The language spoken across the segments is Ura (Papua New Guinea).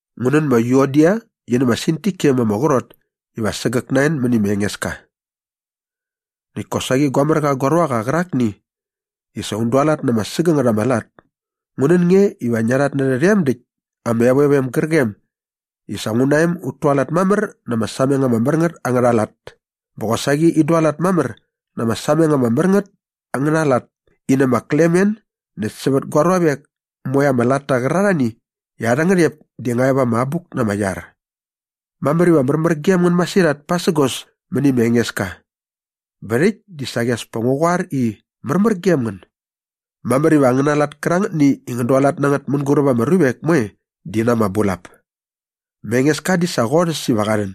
Ngu nän ma Yuodia qi nä ma Sintike ma ama qrot iva sägäk na en mäni ma Engeska. Näkt kosaqi gua mär qa gua ruaqa qärakni i sa un dualat na ama sägängät ama lat, ngu nän nge iva ngia rhatnärhä rhem däkt ama evovem gärqem i sa ngu na em ut tualat mamär na ama sameng ama mär ngät angärha lat bä qosaqi in dualat mamär na ama sameng ama mär ngät angärha lat in nä ma Klemen näkt sävät gua ruavek moe ama latta qärarhani i arhä ngärhep di nga e va ama abuk na ama iar. Mamär iva märmär gem ngän masirhat pasägos mäni ma Engeska. Bä rhäkt di saqi as pa ngu qoar i, “Märmär gem ngän.” Mamär iva angäna lat kärangätni i ngän dualat na ngät mänguräp ama ruvek moe di na ama bulap. Ma Engeska di sa qorhäs iva qa rhän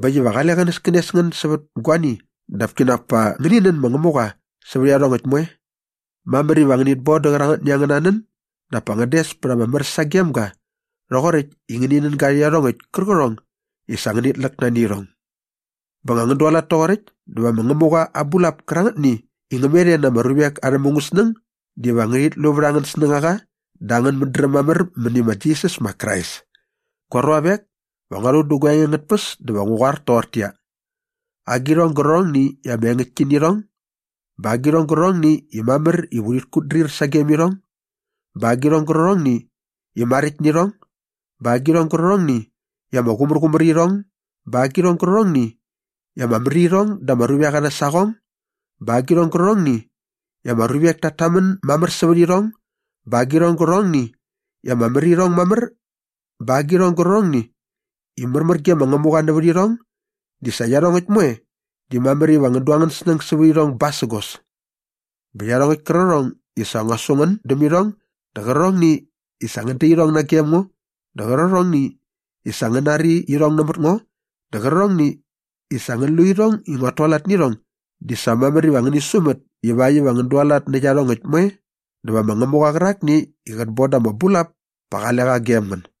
bä äkt iva qale qänäskänes ngän sävät guani dap kinak pa ngäni nän ma Ngämuqa sävät iarhongäkt moe. Mamär iva ngänit bon dä qärangätni angäna nän dap pa ngän des ama mär sagem ga rhoqoräkt i ngäni nän ga rhä iarhongäkt kärqärhong i sa ngänit läk nani irhong. Bä nga ngän dualat toqoräkt dä va ma Ngämuqa aa bulap kärangätni i ngä met e na ama ruvek arhä mungäsnäng diva ngärhit lu vät angän snängaqa dä angän mädräm mamär mäni ma Jisas ma Krais. Gua ruavek, va ngua rhu dä gua enge angät tpäs dä sa va ngu qoar toqortäqyia, agirhong gärqärhongni i ama engäktki nä irhong bä agirhong gärqärhongni i mamär iva urhit kutdrir sagem irhong bä agirhong gärqärhongni i maräkt nä irhong bä agirhong gärqärhongni i ama qumärqumär irhong bä agirhong gärqärhongni i ama mär irhong da ama ruvek arhä saqong bä agirhong gärqärhongni i ama ruvek tat tamän mamär sävät irhong bä agirhong gärqärhongni i ama mär irhong mamär bä agirhong gärqärhongni i märmär ge ma Ngämuqa nävät irhong di sa iarhongäkt moe di mamär iva ngän du angän snäng sävät irhong basägos. Bä iarhongäkt kärqärhong i sa ngua su ngän däm irhong dä qärqärhongni i sa ngän da irhong nagem ngo dä qärqärhongni i sa ngän nari irhong nämät ngo dä qärqärhongni i sa ngän lu irhong i nguat tualat nä irhong di sa mamär iva ngäni sumät ivakt iva ngän dualat nä iarhongäkt moe dä va ma Ngämuqa qärakni i qät bon ut ta ama bulap pa qale qa gem ngän.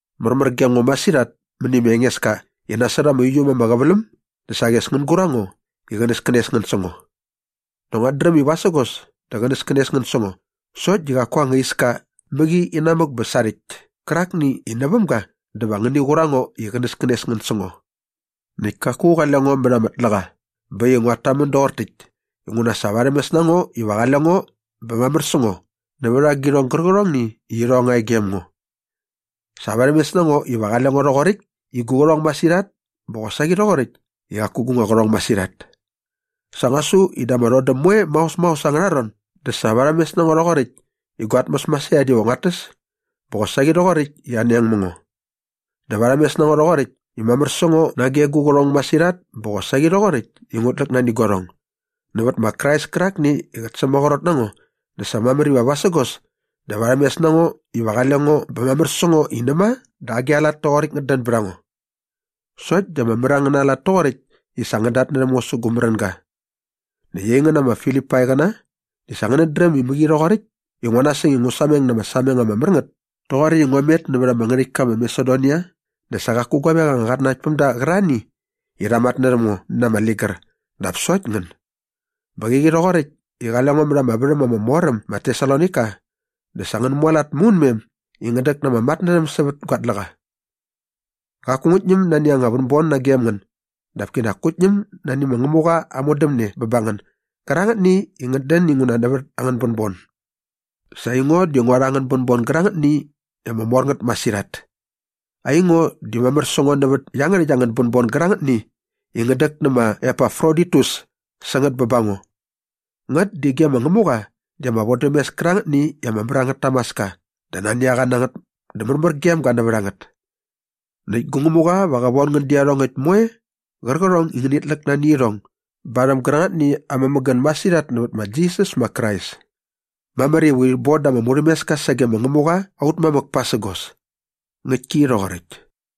Märmär gem ngo masirhat mäni ma Engeska i nasot ama uiu äm ama qäväläm dä saqi as ngän gur a ngo i qänäskänes ngän sä ngo. Nak nguat dräm i vasägos dä qänäskänes ngän sä ngo sokt di qaku angäna anga iska mäqi inamäk bä sarhäkt kärakni i näväm ga dä va ngäni qur a ngo i qänäskänes ngän sä ngo. Näkt kaku qale ngo mät ama tläqa bä äkt i nguat tamän doqor täkt inguna sa varhämes na ngo iva qale ngo bä mamär sä ngo nävät agirhong gärqärhongni i irhong nga e gem ngo. Sa varhämes na ngo iva qale ngo rhoqoräkt i gu qärhong masirhat bä qosaqi rhoqoräkt i qaku gu nga qärhong masirhat. Sa ngua su i da ama rhodäm moe maos maos angärha ron dä sa varhämes na ngo rhoqoräkt i gua tmäs masirhat iva nguat täs bä qosaqi rhoqoräkt i anoeng mä ngo. Dä varhämes na ngo rhoqoräkt i mamär sä ngo nage gu qärhong masirhat bä qosaqi rhoqoräkt i ngut läk nani guarhong. Nävät ma Krais kärakni i qät sämaqrot na ngo dä sa mamär iva vasägos dä varhämes na ngo iva qale ngo bä mamär sä ngo i näma dä agi a lat toqoräkt ngät dän bät a ngo. Sokt di ama mär angäna lat toqoräkt i sa ngän datnärhäm ngo sä gu märänga. Näkt aingän ma Filipaiqäna di sa ngänät dräm i mäqi rhoqoräkt i ngua nasäng i ngu sameng na ama sameng ama mär ngät toqoräkt i ngua met nävät ama ngärhäktka ma Masedonia dä sa qaku guavek anga qatnanaktpämda qärarhani i rha matnärhäm ngo na ama ligär dap sokt ngän. Bä qäqi rhoqoräkt i qale ngo mät ama värhäm ama mor äm ma Tesalonaika dä sa ngän mualat maunmem i ngän däk na ama matnärhäm sävät gua tläqa. Qaku ngut ñäm nani anga vänbon nagem ngän dap kinak ngut ñäm nani ma Ngämuqa aa modämne bä ba ngän gärangätni i ngät dän inguna nävät angän bänbon. Sa aingo di ngua rha angän bänbon gärangätni i ama mor ngät masirhat. Aingo di mamär sä ngo nävät iangärhäkt angän bänbon gärangätni i ngän däk nä ma Epafroditus sä ngät bä ba ngo. Ngät di ge ma Ngämuqa di ama vodämes kärangätni i ama mär angät tamaska dä nani a qa na ngät dä märmär gem ga nävät a ngät. Näkt gu Ngämuqa va qä von ngän dä iarhongäkt moe qärqärhong i ngänit läk nani irhong barhäm gärangätni aa mämägän masirhat nävät ma Jisas ma Krais. Mamär iva urhit bon da ama murhämeska sage ma Ngämuqa aut mamäk pasägos. Ngäktki rhoqoräkt.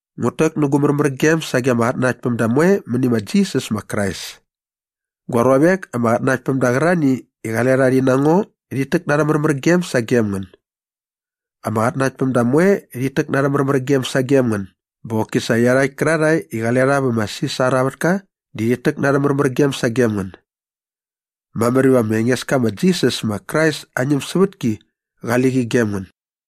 Ngut täk nä gu märmärgem sage ama qatnanaktpämda moe mäni ma Jisas ma Krais. Gua ruavek ama qatnanaktpämda qärarhani i qale rha rhi na ngo rhit täk na arhä märmärgem sagem ngän. Ama qatnanaktpämda moe rhit täk na arhä märmärgem sagem ngän bä qoki sa iarhakt kärarhae i qale rha vä ma Sisar aa vätka di rhit täk na arhä märmärgem sagem ngän. Mamär iva ma Engeska ma Jisas ma Krais aa ñämsävätki qali qi gem ngän.